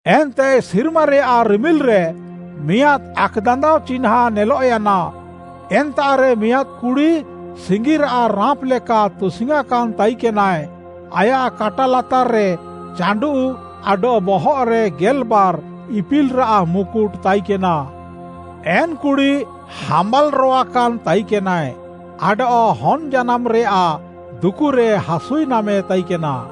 ଏନ୍ତେ ସିର୍ମାରେୟାଃ ରିମିଲ୍‌ରେ ମିଆଁଦ୍‌ ଆକ୍‌ଦାନ୍ଦାଅ ଚିହ୍ନାଁଁ ନେଲଃୟାନା, ଏନ୍ତାଃରେ ମିଆଁଦ୍‌ କୁଡ଼ି ସିଙ୍ଗିରାଃ ରାଁପ୍‌ ଲେକା ତୁସିଙ୍ଗ୍‌ୟାଁକାନ୍‌ ତାଇକେନାଏ। ଆୟାଃ କାଟା ଲାତାର୍‌ରେ ଚାଣ୍ଡୁଃ ଆଡଃ ବହଃରେ ଗେଲ୍‌ବାର୍‌ ଇପିଲ୍‌ରାଃ ମୁକୁଟ୍‌ ତାଇକେନା। ଏନ୍‌ କୁଡ଼ି ହାମ୍ବାଲ୍‌ରୋୱାକାନ୍‌ ତାଇକେନାଏ ଆଡଃ ହନ୍‌ ଜାନାମଃରେୟାଃ ଦୁକୁରେ ହାସୁଇ ନାମେ ତାଇକେନା।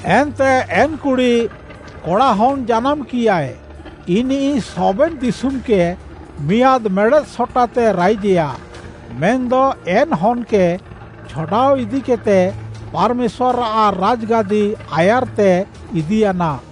ଏନ୍ତେ ଏନ୍‌ କୁଡ଼ି, କଡ଼ାହନ୍‍ ଜାନାମ୍‌କିୟାଏ, ଇନିଃ ସବେନ୍ ଦିଶୁମ୍‌କେ ମିଆଁଦ୍‌ ମେଡ଼େଦ୍‌ ସଟାତେ ରାଇଜେୟା। ମେନ୍‌ଦ ଏନ୍‌ ହନ୍‌କେ ଛଡ଼ାଅ ଇଦିକେଦ୍‌ତେ ପାର୍‌ମେଶ୍ୱାର୍‌ଆଃ ରାଜ୍‌ଗାଦି ଆୟାର୍‌ତେ ଇଦିୟାନା।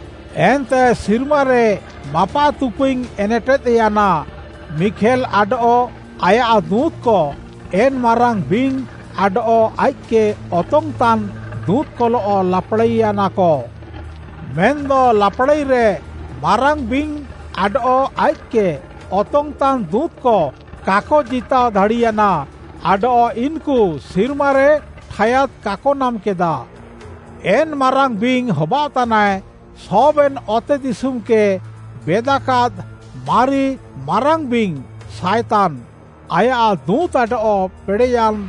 ଏନ୍ତେ ସିର୍ମାରେ ମାପାଃତୁପୁଇଙ୍ଗ୍‌ ଏନେଟେଦ୍‌ୟାନା। ମିଖେଲ୍‌ ଆଡଃ ଆୟାଃ ଦୁଁତ୍‌କ, ଏନ୍‌ ମାରାଙ୍ଗ୍‌ ବିଙ୍ଗ୍‌ ଆଡଃ ଆଇଃକ୍‌କେ ଅତଙ୍ଗ୍‌ତାନ୍‌ ଦୁଁତ୍‌କଲଃ ଲାପାଡ଼ାଇୟାନାକ। ମେନ୍‌ଦ ଲାପାଡ଼ାଇରେ ମାରାଙ୍ଗ୍‌ ବିଙ୍ଗ୍‌ ଆଡଃ ଆଇଃକ୍‌କେ ଅତଙ୍ଗ୍‌ତାନ୍‌ ଦୁଁତ୍‌କ କାକ ଜିତାଅ ଦାଡ଼ିୟାନା ଆଡଃ ଇନ୍‌କୁ ସିର୍ମାରେ ଠାୟାଦ୍‌ କାକ ନାମ୍‌କେଦା। ଏନ୍‌ ମାରାଙ୍ଗ୍‌ ବିଙ୍ଗ୍‌ ହବାଅଃତାନାଏ, ସବେନ୍‌ ଅତେଦିଶୁମ୍‌କେ ବେଦାକାଦ୍‌ ମାରି ମାରାଙ୍ଗ୍‌ ବିଙ୍ଗ୍‌, ସାଏତାନ୍‌; ଆୟାଃ ଦୁଁତ୍‌ ଆଡଃ ପେଡ଼େୟାନ୍‌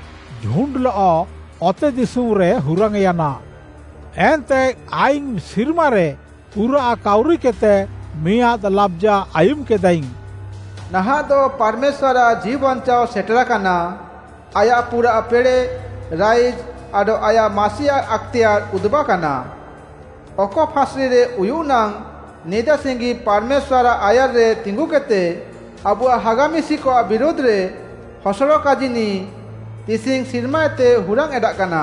ଝୁଣ୍ଡ୍‌ଲଃ ଅତେଦିଶୁମ୍‌ରେ ହୁରାଙ୍ଗ୍‌ୟାନା। ଏନ୍ତେ ଆଇଙ୍ଗ୍‌ ସିର୍ମାରେ ପୁରାଃ କାଉରିକେଦ୍‌ତେ ମିଆଁଦ୍‌ ଲାବ୍‌ଜା ଆୟୁମ୍‌କେଦାଇଙ୍ଗ୍‌, “ନାହାଁଃଦ ପାର୍‌ମେଶ୍ୱାର୍‌ଆଃ ଜୀଉବାଞ୍ଚାଅ ସେଟେରାକାନା। ଆୟାଃ ପୁରାଃ ପେଡ଼େଃ, ରାଇଜ୍‌ ଆଡଃ ଆୟାଃ ମାସିଆଃ ଆକ୍‌ତେୟାର୍‌ ଉଦୁବାକାନା। ଅକ ଫାଁସ୍‌ରିରେ ଉୟୁଃ ନାଙ୍ଗ୍‌ ନିଦାସିଙ୍ଗି ପାର୍‌ମେଶ୍ୱାର୍‌ଆଃ ଆୟାର୍‌ରେ ତିଙ୍ଗୁକେଦ୍‌ତେ, ଆବୁଆଃ ହାଗା ମିଶିକଆଃ ବିରୁଧ୍‌ରେ ହସଡ଼ କାଜିନିଃ ତିସିଙ୍ଗ୍‌ ସିର୍ମାଏତେ ହୁରାଙ୍ଗ୍‌ ଏଣ୍ଡାଃକାନା।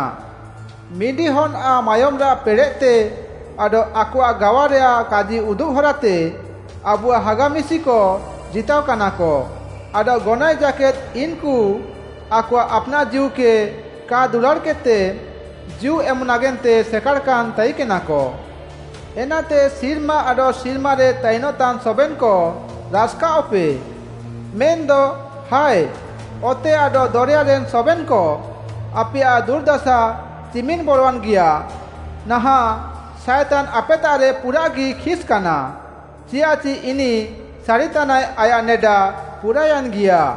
ମିଣ୍ଡିହନ୍‌ଆଃ ମାୟୋମ୍‌ରାଃ ପେଡ଼େଃତେ ଆଡଃ ଆକଆଃ ଗାୱାରେୟାଃ କାଜି ଉଦୁବ୍‌ ହରାତେ ଆବୁଆଃ ହାଗା ମିଶିକ ଜିତାଅକାନାକ, ଆଡଃ ଗନଏଃ ଜାକେଦ୍‌ ଇନ୍‌କୁ ଆକଆଃ ଆପ୍‌ନାଃ ଜୀଉକେ କା ଦୁଲାଡ଼୍‌କେଦ୍‌ତେ ଜୀଉ ଏମ୍‌ ନାଗେନ୍ତେ ସେକାଡ଼ାକାନ୍‌ ତାଇକେନାକ। ଏନାତେ ସିର୍ମା ଆଡଃ ସିର୍ମାରେ ତାଇନ୍‌ତାନ୍‌ ସବେନ୍‌କ ରାସ୍‌କାଅଃପେ। ମେନ୍‌ଦ ହାଏ, ଅତେ ଆଡଃ ଦରେୟାରେନ୍‌ ସବେନ୍‌କ, ଆପେୟାଃ ଦୁର୍‌ଦାସା ଚିମିନ୍‌ ବରୱାନ୍‌ଗିଆ! ନାହାଁଃ ସାଏତାନ୍‌ ଆପେତାଃରେ ପୁରାଃଗି ଖିସ୍‌କାନା, ଚିଆଃଚି ଇନିଃ ସାରିତାନାଏ ଆୟାଃ ନେଡା ପୁରାୟାନ୍‌ଗିଆ।”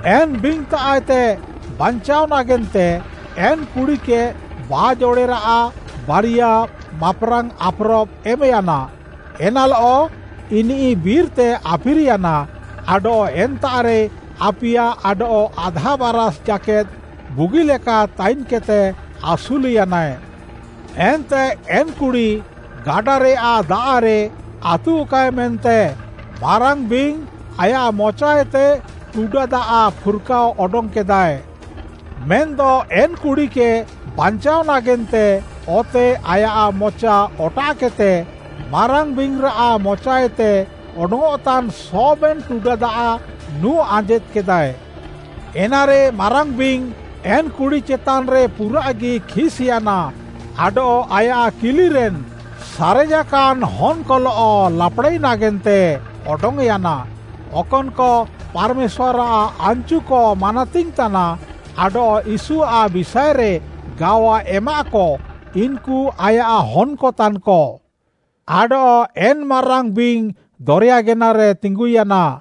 ଏନ୍‌ ବିଙ୍ଗ୍‌ତାଃଏତେ ବାଞ୍ଚାଅଃ ନାଗେନ୍ତେ, ଏନ୍‌ କୁଡ଼ିକେ ବାଜ୍‌ ଅଡ଼େରାଃ ବାରିୟା ମାପ୍‌ରାଙ୍ଗ୍‌ ଆପ୍‌ରବ୍‌ ଏମ୍‌ୟାନା। ଏନାଃଲଃ ଇନିଃ ବିର୍‌ତେ ଆଫିର୍‌ୟାନା ଆଡଃ ଏନ୍ତାଃରେ ଆପିୟା ଆଡଃ ଆଧା ବାରାଷ୍‌ ଜାକେଦ୍‌ ବୁଗିଲେକା ତାଇନ୍‌କେଦ୍‌ତେ ଆସୁଲ୍‌ୟାନା। ଏନ୍ତେ ଏନ୍ କୁଡ଼ି ଗାଡ଼ାରେୟାଃ ଦାଆଃରେ ଆତୁଃକାଏ ମେନ୍ତେ ମାରାଙ୍ଗ୍‌ ବିଙ୍ଗ୍‌ ଆୟାଃ ମଚାଏତେ ଟୁଡା ଦାଆଃ ଫୁର୍‍କାଅ ଅଡଙ୍ଗ୍‌କେଦାଏ। ମେନ୍‌ଦ ଏନ୍‌ କୁଡ଼ିକେ ବାଞ୍ଚାଅ ନାଗେନ୍ତେ ଅତେ ଆୟାଃ ମଚା ଅଟାଃକେଦ୍‌ତେ, ମାରାଙ୍ଗ୍‌ ବିଙ୍ଗ୍‌ରାଃ ମଚାଏତେ ଅଡଙ୍ଗ୍‌ଅଃତାନ୍‌ ସବେନ୍‌ ଟୁଡା ଦାଆଃ ନୁଁ ଆଞ୍ଜେଦ୍ କେଦାଏ। ଏନାରେ ମାରାଙ୍ଗ୍‌ ବିଙ୍ଗ୍‌ ଏନ୍‌ କୁଡ଼ି ଚେତାନ୍‌ରେ ପୁରାଃଗି ଖିସ୍‌ୟାନା ଆଡଃ ଆୟାଃ କିଲିରେନ୍‌ ସାରେଜାକାନ୍‌ ହନ୍‍କଲଃ ଲାପ୍‌ଡ଼ାଇ ନାଗେନ୍ତେ ଅଡଙ୍ଗ୍‌ୟାନା। ଅକନ୍‌କ ପାର୍‌ମେଶ୍ୱାର୍‌ଆଃ ଆନ୍‌ଚୁକ ମାନାତିଙ୍ଗ୍‌ ତାନା ଆଡଃ ୟୀଶୁଆଃ ବିଷାଏରେ ଗାୱା ଏମାଃକ, ଇନ୍‌କୁ ଆୟାଃ ହନ୍‌କ ତାନ୍‌କ। ଆଡଃ ଏନ୍‌ ମାରାଙ୍ଗ୍‌ ବିଙ୍ଗ୍‌ ଦରେୟା ଗେନାରେ ତିଙ୍ଗୁୟାନା।